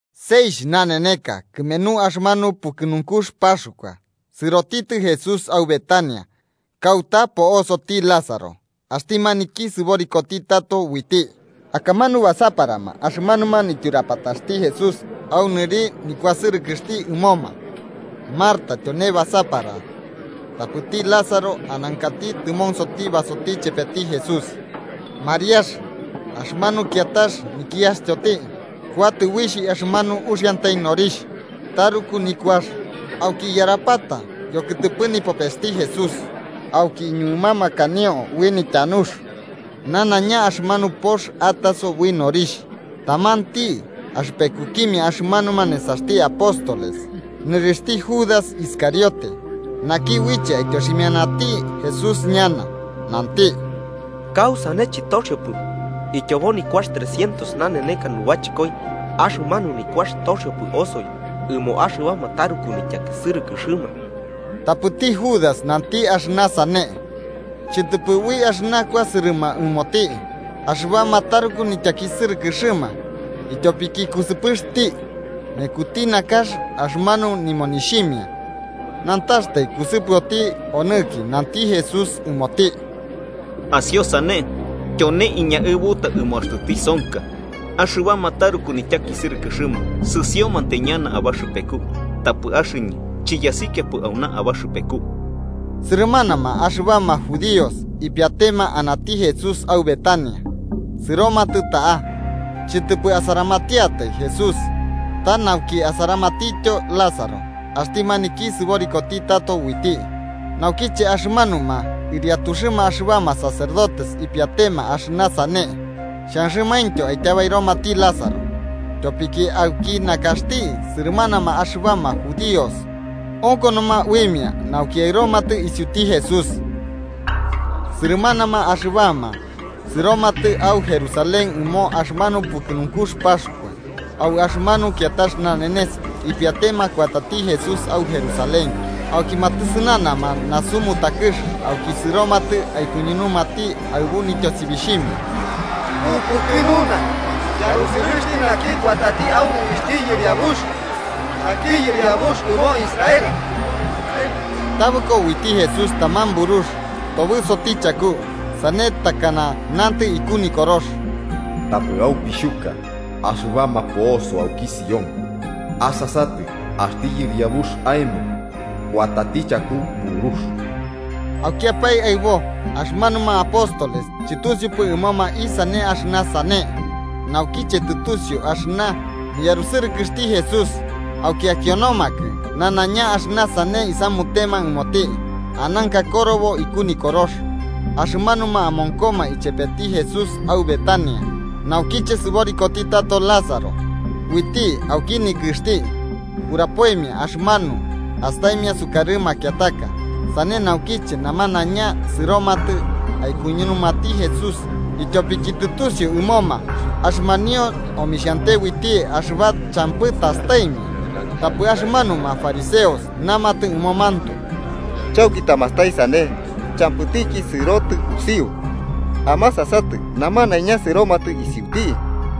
Seixh naneneka kɨmenu axɨmanu pukɨnunkux Paxkua, sɨrotitɨ Jesús au Betania, kauta po'osoti Lázaro, axti maniki sɨborikoti tato uiti. Akamanu basaparama axɨbama nityurapataxti Jesús au nɨri nikuasɨrɨkɨxti ɨmoma. Marta tyone basapara tapɨti Lázaro anankati tɨmonsoti basoti chepeti Jesús. Mariax, axɨmanu kiatax nikiastyoti, kuatɨ uixh axɨmanu uxiantai norixh taruku nikuax auki iyarapata yokɨtɨpɨ nipopesti Jesús. Auki iñuɨmamakanio ui nityanux, nanaiña axɨmanu pox atasopo ui norixh. Tamanti axɨpekukimia axɨmanuma nesaxti apóstoles, nɨrixhti Judas Iscariote, naki uiche aityoximianati Jesús ñana, nanti: 5–¿Kausane chɨtoxiopɨ ityobo nikuax trescientos naneneka nubachɨkoi, axɨmanu nikuax toxiopɨ osoi ɨmo axɨbama taruku nityakisɨrɨkɨxɨma? Tapɨti Judas nanti axɨna sane, chɨtɨpɨ ui axɨna kuasɨrɨma ɨmoti axɨbama taruku nityakisɨrɨkɨxɨma, ityopiki kusɨpɨxti, mekuti nakax axɨmanu nimonixhimia, nantaxtai kusɨpɨoti aruki. Nanti Jesús ɨmoti: –Asio sane, tyone iñaɨbuta ɨmo axtɨ tisonka. Axɨbama taruku nityakisɨrɨkɨxɨma sɨsiomantai ñana abaxɨpeku, tapɨ axɨñɨ chiyasikiapɨ auna abaxɨpeku. Sɨrɨmanama axɨbama judíos ipiatema anati Jesús au Betania, sɨromatɨ ta'a chɨtɨpɨ asaramatiatai Jesús ta nauki asaramatityo Lázaro, axti maniki sɨborikoti tato uiti. Naukiche axɨmanuma ɨriatuxɨma axɨbama sacerdotes ipiatema axɨna sane xhanxɨmaintyo aityabairomati Lázaro, tyopiki auki nakaxti sɨrɨmanama axɨbama judíos onkonoma uimia nauki aɨromatɨ isiuti Jesús. Sɨrɨmanama axɨbama sɨromatɨ au Jerusalén ɨmo axɨmanu pukɨnunkux Paxkua. Au axɨmanu kiatax nanenes, ipiatema kuatati Jesús au Jerusalén. Auki matɨsɨnanama nasu mutakɨx auki sɨromatɨ aikuñunumati, aɨbu nityosibixhimia: –¡Upukɨnuna! ¡Yarusɨrɨxti naki kuatati au nɨrixhti Yɨriabux, naki Yɨriabux ɨmo Israel! Tabɨko uiti Jesús taman burux tobɨsoti chaku, sane takana nantɨ iku Nikorox: “Tapɨ aupixhuka axɨbama po'oso auki Sión. Asasatɨ, axti yɨriabux aemo kuatati chaku burux.” Aukiapae aɨbo, axɨmanuma apóstoles chɨtusiupɨ ɨmoma isane axɨna sane. Naukiche tɨtusiu axɨna niyarusɨrɨkɨxti Jesús, auki akionomakɨ nanaiña axɨna sane isamutema ɨmoti ananka korobo iku Nikorox. Axɨmanuma amonkoma ichepeti Jesús au Betania naukiche sɨborikoti tato Lázaro uiti auki nikɨxti, urapoimia axɨmanu astaimia sukarɨ makiataka. Sane naukiche namanaiña sɨromatɨ aikuñunumati Jesús, ityopiki tɨtusiu ɨmoma axɨmanio omixhante uiti axɨba champɨ tastaimia. Tapɨ axɨmanuma fariseos namatɨ ɨmomantoe: –Chauki tamastai sane champɨtiki sɨrotɨ usiu. Amasasatɨ, ¡namanaiña sɨromatɨ isiuti!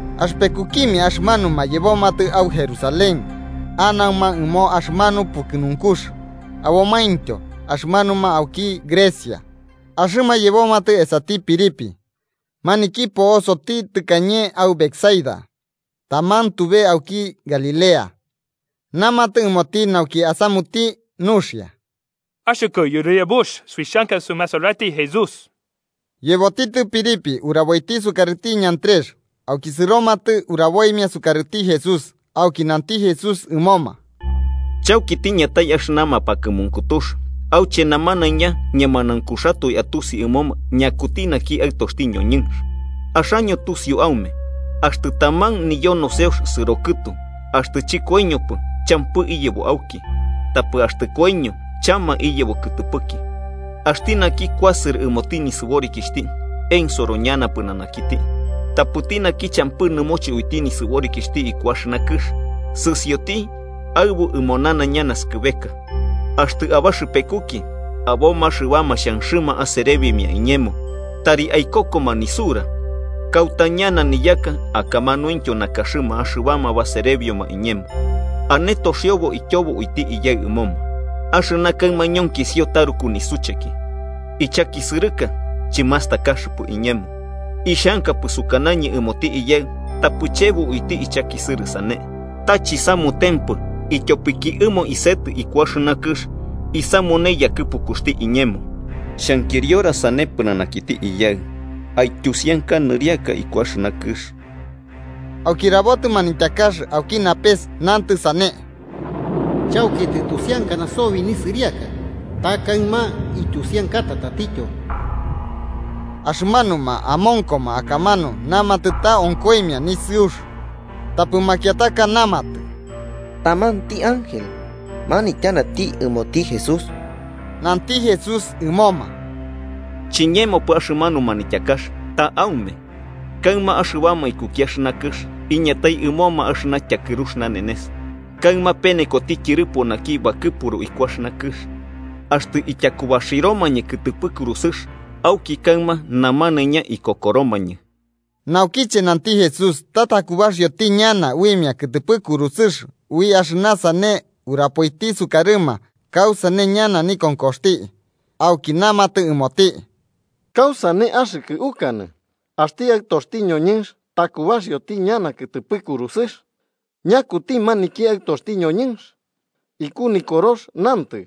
Axɨpekukimia axɨmanuma yebomatɨ au Jerusalén anauma ɨmo axɨmanu pukɨnunkux, abomaintyo axɨmanuma auki Grecia. Axɨma yebomatɨ esati Felipe, maniki po'osoti tɨkañe au Betsaida, taman tube auki Galilea, namatɨ ɨmoti nauki asamuti nuxia: –Axɨkɨ Yɨriabux, suixhanka sumasarati Jesús. Yebotitɨ Felipe uraboiti sukarɨti Andrés, auki sɨromatɨ uraboimia isukarɨti Jesús. Auki nanti Jesús ɨmoma: –Chauki tiñatai axɨna mapakɨmunkutux auche namanaiña ñemanaunkuxatoe atusi ɨmoma ñakuti naki Aɨtoxti ñoñɨnx. Axaño tusiu aume axtɨ taman niyo noseox sɨro kɨtu axtɨ chɨkoiñopɨ, champɨ iyebo auki. Tapɨ axtɨ koiño, chama iyebo kɨtɨpɨki. Axti naki kuasɨrɨ ɨmoti nisɨborikixhti, ensoro ñana pɨnanakiti. Tapɨti naki champɨ nɨmoche uiti nisɨborikixhti iku axɨna kɨx, sɨsioti aɨbu ɨmo nanaiña naskɨbeka. Axtɨ abaxɨpekuki aboma axɨbama xhanxɨma aserebimia iñemo, tari aikokoma nisura. Kauta ñana niyaka akamanuintyo nakaxɨma axɨbama baserebioma iñemo, ane toxiobo ityobo uiti Iyaɨ ɨmoma. ¡Axɨna kaɨma ñonkisio taruku nisucheki! Ichakisɨrɨka chimastakaxɨpɨ iñemo. Ixhankapɨ sukanañɨ ɨmoti Iyaɨ tapɨ chebo uiti ichakisɨrɨ sane. Ta chisamutempɨ ityopiki ɨmo isetɨ iku axɨna kɨx isamune yakɨpukuxti iñemo. Xhankiriora sane pɨnanakiti Iyaɨ: “Aityusianka nɨriaka iku axɨna kɨx.” Auki rabotɨ manityakax auki napes, nantɨ sane: “Chauki tɨtusiankana sobi nisɨriaka, ta kaɨma ityusiankata tatityo.” Axɨmanuma amonkoma akamanu namatɨ ta onkoimia nisɨux. Tapɨ makiataka namatɨ: –Tamanti ángel manityanati ɨmoti Jesús. Nanti Jesús ɨmoma: –Chiñemopɨ axɨmanu manityakax, ta aume. Kaɨma axɨbama ikuki axɨna kɨx iñatai ɨmoma axɨna tyakɨrux nanenes, kaɨma penekoti tyɨrɨpo naki bakɨpuru iku axɨna kɨx. Axtɨ ityakubaxiromañɨ kɨtɨpɨ kurusɨx, auki kaɨma namanaiña ikokoromañɨ. Naukiche nanti Jesús ta takubaxioti ñana uimia kɨtɨpɨ kurusɨx, ui axɨna sane, urapoiti sukarɨma kausane ñana nikonkoxti. Auki namatɨ ɨmoti: –¿Kausane axɨkɨ ukanɨ axti Aɨtoxti ñoñɨnx takubaxioti ñana kɨtɨpɨ kurusɨx? ¿Ñakuti maniki Aɨtoxti ñoñɨnx? Iku Nikorox nantɨ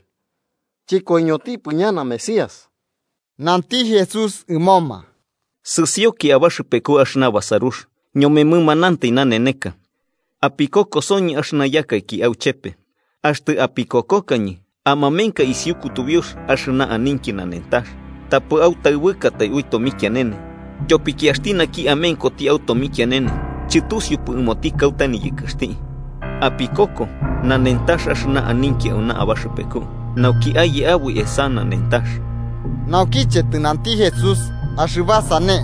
chɨkoiñotipɨ ñana Mesías. Nanti Jesús ɨmoma: –Sɨsioki abaxɨpeku axɨna basarux, ñome mɨmanantai naneneka. Apikokosoñɨ axɨna yakaiki auchepe. Axtɨ apikokokañɨ amamenka isiu kutubiux axɨna aninki nanentax, tapɨ autabɨkatai ui tomikianene. Tyopiki axti naki amenkoti au tomikianene chɨtusiupɨ ɨmoti kauta niyɨkɨxti. Apikoko nanentax axɨna aninki auna abaxɨpeku, nauki aye aboi esa nanentax. Naukiche tɨnanti Jesús axɨba sane,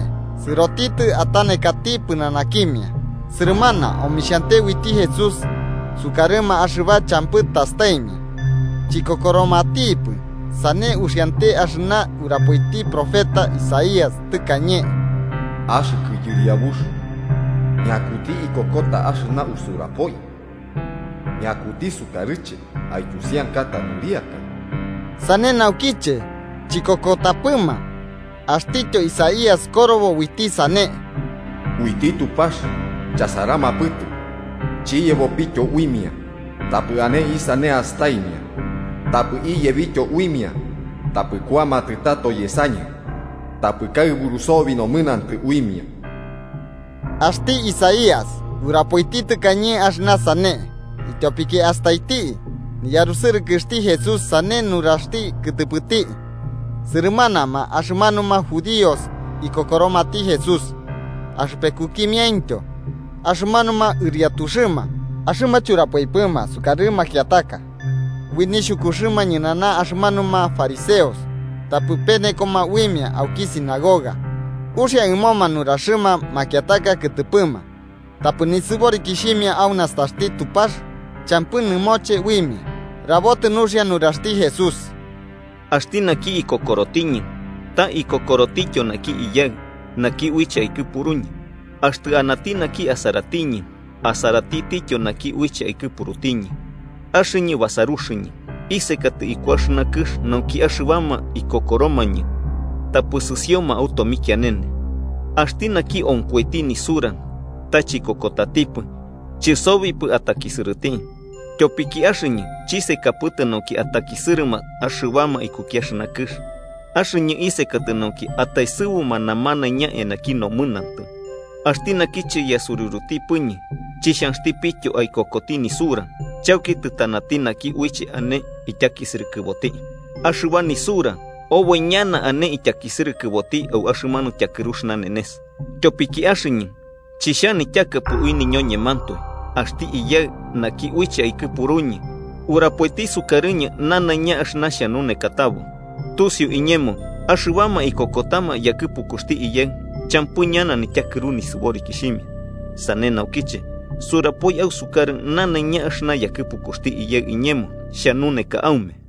sɨrotitɨ atanekati pɨnanakimia. Sɨrɨmana omixhante uiti Jesús sukarɨma axɨba champɨ tastaimia, chikokoromatipɨ. Sane uxiante axɨna urapoiti profeta Isaías tɨkañe: “Axɨkɨ Yɨriabux, ¿ñakuti ikokota axɨna usurapoi? ¿Ñakuti sukarɨche aityusiankata nɨriaka?” Sane naukiche chikokotapɨma, axtityo Isaías korobo uiti sane: “Uiti Tupax chasaramapɨtɨ chiyebopityo uimia, tapɨ ane isane astaimia tapɨ iyebityo uimia. Tapɨ kuamatɨ tato yesañɨ, tapɨ kaɨburu sobi nomɨnantɨ uimia.” Axti Isaías urapoiti tɨkañe axɨna sane, ityopiki astaiti niyarusɨrɨkɨxti Jesús, sane nuraxti kɨtɨpɨti. Sɨrɨmanama axɨmanuma judíos ikokoromati Jesús, axɨpekukimiaintyo axɨmanuma ɨriatuxɨma. Axɨma churapoipɨma sukarɨ makiataka ui nixhukuxɨma ñɨnana axɨmanuma fariseos, tapɨ penokoma uimia auki sinagoga. Uxia ɨmoma nuraxɨma makiataka kɨtɨpɨma tapɨ nisɨborikixhimia au nastaxti Tupax champɨ nɨmoche uimia. Rabotɨ nuxia nuraxti Jesús: “Axti naki ikokorotiñɨ, ta ikokorotityo naki Iyaɨ, naki uiche aikɨpuruñɨ. Axtɨ anati naki asaratiñɨ, asaratityo naki uiche aikɨpurutiñɨ. Axɨñɨ, basaruxɨñɨ, isekatɨ iku axɨna kɨx nauki axɨbama ikokoromañɨ tapɨ sɨsioma au tomikianene. Axti naki onkoiti nisura ta chikokotatipɨ, chɨsobipɨ atakisɨrɨti. Tyopiki axɨñɨ chisekapɨtɨ nauki atakisɨrɨma axɨbama ikuki axɨna kɨx, axɨñɨ isekatɨ nauki ataesɨbuma namanaiña eanaki nomɨnantɨ. Axti naki chiyasuriurutipɨñɨ chixhanxtipityo aikokoti nisura, chauki tɨtanati naki uiche ane ityakisɨrɨkɨboti: axɨba nisura oboi ñana ane ityakisɨrɨkɨboti au axɨmanu tyakɨrux nanenes. Tyopiki axɨñɨ chixhanityakapɨ ui niñoñemantoe. Axti Iyaɨ, naki uiche aikɨpuruñɨ urapoiti sukarɨñɨ nanaiña axɨna xhanunekatabo. Tusiu iñemo axɨbama ikokotama yakɨpukuxti Iyaɨ champɨ ñana nityakɨru nisɨborikixhimia. Sane naukiche surapoi ausukarɨ nanaiña axɨna yakɨpukuxti Iyaɨ iñemo xhanuneka aume.”